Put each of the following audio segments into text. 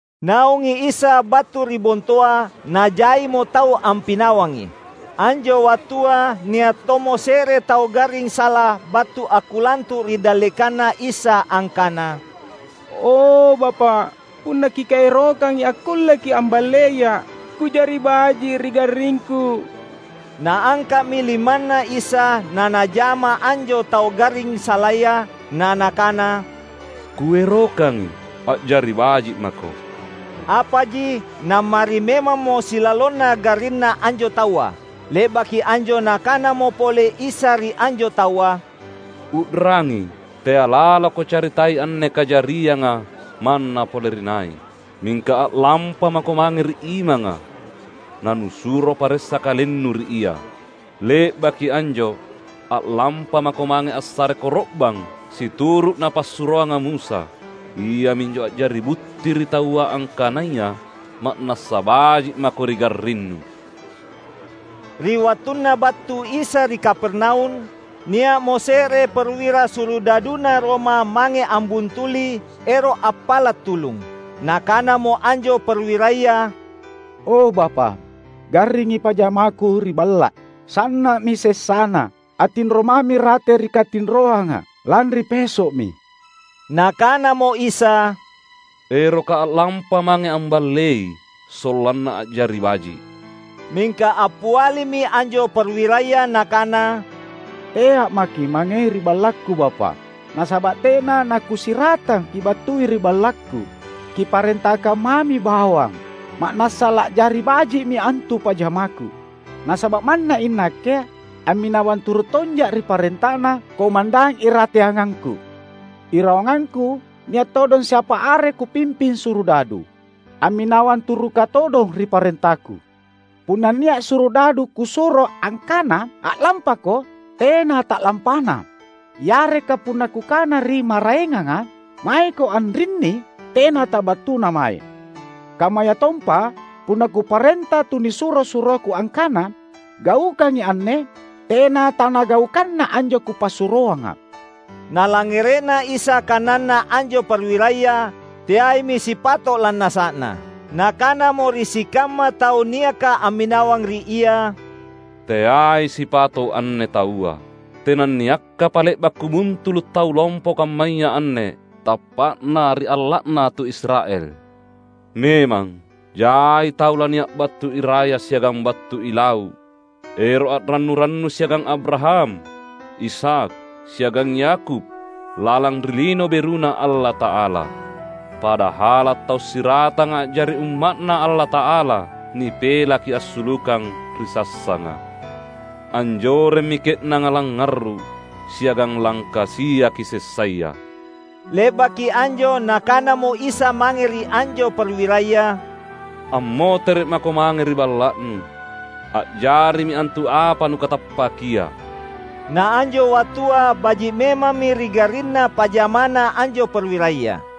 Naungi Isa battu ri bontoa, najaimo tau ampinawangi. Anjo wattua nia’ tommo se’re tau garring sala battu akkulantu’ ri dallekanNa Isa angkana, "O, Bapa’, punna Kierokangi akkulleKi’ amballeia’ ku’jari baji’ ri garringku." Naangka’mi limanNa Isa naNajama anjo tau garring salaya, na Nakana, "Kuerokangi, a’jari baji’ mako!" Apaji nammari memammo silalonna garrinna anjo taua. Le’baki anjo Nakanamo pole Isa ri anjo taua, "U’rangi! Tea’ laloko caritai anne kajarianga manna pole ri nai. Mingka a’lampamako mange ri imanga, na nusuro paressa kalennu ri ia. Le’baki anjo, a’lampamako mange assare koro’bang situru’ napassuroanga Musa; iaminjo a’jari butti ri taua angkanaya ma’nassa baji’ mako ri garrinnu!" Ri wattunna battu Isa ri Kapernaum, nia’mo se’re perwira surudaduna Roma mange ambuntuli, ero’ appala’ tulung. Nakanamo anjo perwiraya, "O, Bapa’, garringi pajamaku ri balla’. Sanna’mi sessana, attinro mami rate ri katinroanga lanri peso’mi." Nakanamo Isa, "ErokKa’ a’lampa mange amballei, sollanna a’jari baji’." Mingka appialimi anjo perwiraya nakana, "Tea’ maKi’ mangei ri ballakku Bapa’. Nasaba’ tena nakusiratang Kibattui ri ballakku. Kiparentakang mami bawang, ma’nassa la’jari baji’mi antu pajamaku. Nasaba’ manna inakke amminawang turu’ tonja’ ri parentana komandang irateangangku. Irawangangku nia’ todong siapa are kupimping surudadu, amminawang turuka todong ri parentaku. Punna nia’ surudadu kusuro angkana, ‘A’lampako,’ tena ta’lampana. Yareka punna kukana ri maraenganga, ‘Maeko anrinni,’ tena tabattuna mae; kammayatompa punna kuparenta tunisuro-suroku angkana, ‘Gaukangi anne!’ tena tanagaukanna anjo kupassuroanga." Nalangngere’na Isa kananna anjo perwiraya, teaimi sipato’ lannasa’na. Nakanamo ri sikamma tau niaka amminawang ri Ia, "Teai sipato’ anne taua. Tenanniakkapa le’ba’ Kubuntulu’ tau lompo kammaya anne tappa’na ri alla’na tu Israel! Memang, jai tau lania’ battu iraya siagang battu ilau’ ero’ a’rannu-rannu siagang Abraham, Ishak, siagang Yakub, lalang ri Lino BeruNa Allata’ala. Padahala’ tau siratanga a’jari umma’Na Allata’ala nipelaki assulukang ri sassanga. Anjoremmi ke’nanga langngarru’ siagang langkasiaki sessaya." Le’baki anjo Nakanamo Isa mange ri anjo perwiraya, "Ammotere’ mako mange ri balla’nu, a’jarimi antu apa nukatappakia." Naanjo wattua baji’ memammi ri garrinna pajamana anjo perwiraya.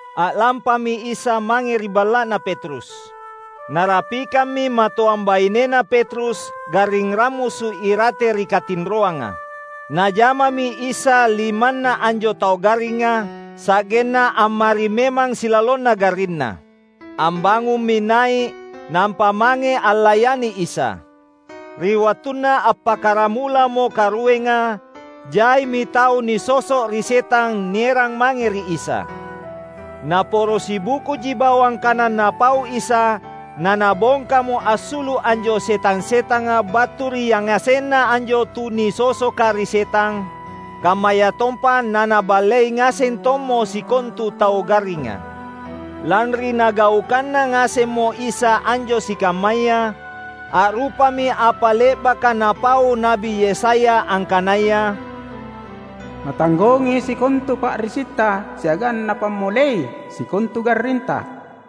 A’lampami Isa mange ri balla’na Petrus. Narapikammi matoang bainena Petrus garring rammusu’ irate ri katinroanga. Najamami Isa limanna anjo tau garringa, sa’genna ammari memang silalonna garrinna. Ambangummi nai’, nampa mange allayani Isa. Ri wattunna appakkaramulamo karuenga, jaimi tau nisoso’ ri setang nierang mange ri Isa. Naporo sibukuji bawang kana Napau Isa naNabongkamo assulu’ anjo setang-setanga battu ri yangasenna anjo tunisosoka ri setang, kammayatompa naNaballei ngaseng tommo sikontu tau garringa. Lanri Nagaukanna ngasemmo Isa anjo sikammaya, a’rupami apa le’baka napau Na’bi Yesaya angkanaya, "Natanggongi sikontu pa’risitta siagang Napammolei sikontu garrinta."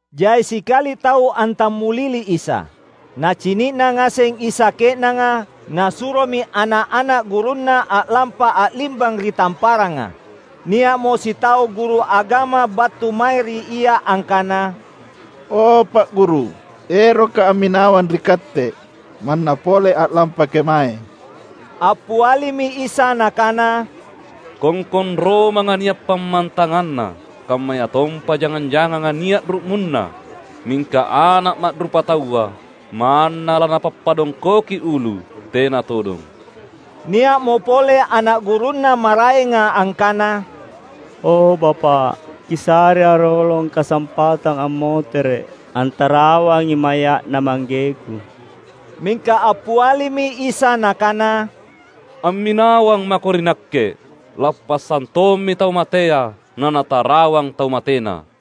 Jai sikali tau antammulili Isa. Nacini’na ngaseng Isa ke’nanga, Nasuromi ana’-ana’ gurunNa a’lampa a’limbang ri tamparanga. Nia’mo sitau guru agama battu mae ri Ia angkana, "O Pa’ Guru, erokka’ amminawang ri Katte, manna pole a’lampa kemae!" Appialimi Isa Nakana, "Kongkong romanga nia’ pammantanganna; kammayatompa jangang-janganga nia’ ru’munna. Mingka Ana’ Ma’rupataua manna laNapappadongkoki ulu tena todong." Nia’mo pole ana’ gurunNa maraenga angkana, "O Bapa’, Kisarea’ rolong kasampatang ammotere’ antarawangi maya’na manggeku." Mingka appialimi Isa Nakana, "Amminawang mako ri Nakke; lappassang tommi tau matea nanatarawang tau matena."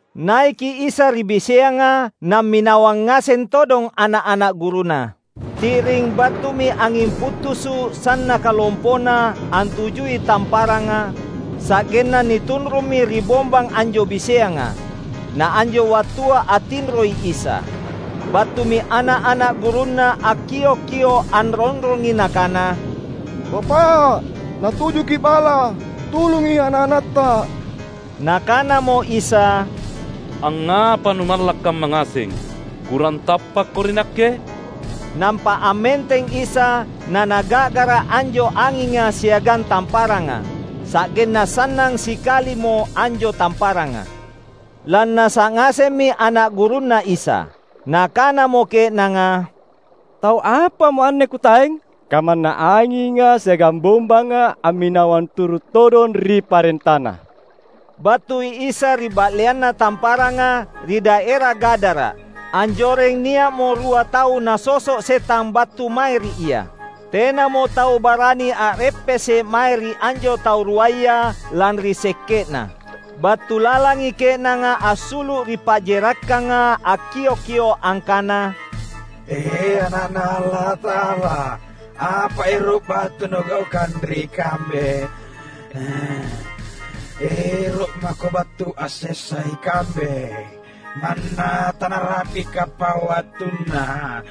Naiki Isa ri biseanga, namminawang ngaseng todong ana’-ana’ gurunNa. Ti’ring battumi anging puttusu’ sannaka lompona antujui tamparanga, sa’genna nitunrummi ri bombang anjo biseanga. Na anjo wattua attinroi Isa. Battumi ana’-ana’ gurunNa akkiok-kio’ anronrongi nakana, "Bapa’, natujuki’ bala, tulungi ana’-anatTa!" Nakanamo Isa, "Angngapa numalla’ kamma ngaseng? Kurang tappakko ri Nakke?" Nampa ammenteng Isa, naNaga’gara’ anjo anginga siagang tamparanga. Sa’genna sannang sikalimo anjo tamparanga. Lannasa’ ngasemmi ana’ gurunNa Isa. Nakanamo ke’nanga, "Tau apamo anne kutaeng? Kamanna anginga siagang bombanga amminawang turu’ todong ri parentaNa!" Battui Isa ri ba’leanna tamparanga, ri daera Gadara. Anjoreng nia’mo rua tau nasoso’ setang battu mae ri Ia. Tenamo tau barani a’reppese’ mae ri anjo tau ruaya, lanri sekke’na. Battu lalangi ke’nanga assulu’ ri pa’jerakkanga akkiok-kio’ angkana, "E Ana’Na Allata’ala! Apa ero’ battu nugaukang ri kambe? Ero’ mako battu ansessai kambe, manna tanarapikapa wattunna?"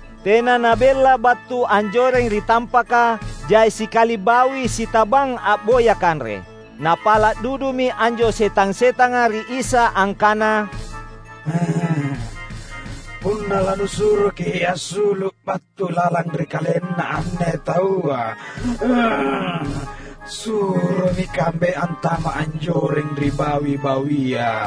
Tena nabella battu anjoreng ri tampaka, jai sikali bawi sitabang a’boya kanre. Napala’ dudumi anjo setang-setanga ri Isa angkana, "Punna lanusuroki’ assulu’ battu lalang ri kalenna anne taua, suromi kambe antama’ anjoreng ri bawi-bawia."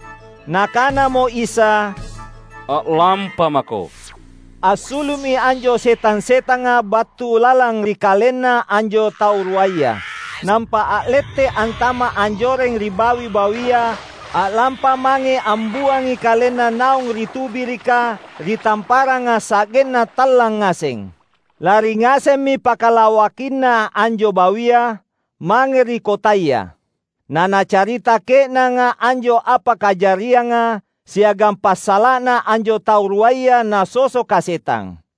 Nakanamo Isa, "A’lampamako!" Assulu’mi anjo setang-setanga battu lalang ri kalenna anjo tau ruaya. Nampa a’lette’ antama’ anjoreng ri bawi-bawia a’lampa mange ambuangi kalenna naung ri tubirika ri tamparanga sa’genna tallang ngaseng. Lari ngasemmi pakalawakinna anjo bawia, mange ri kotaya; nanacarita ke’nanga anjo apa kajarianga, siagang passala’na anjo tau ruaya nasosoka setang.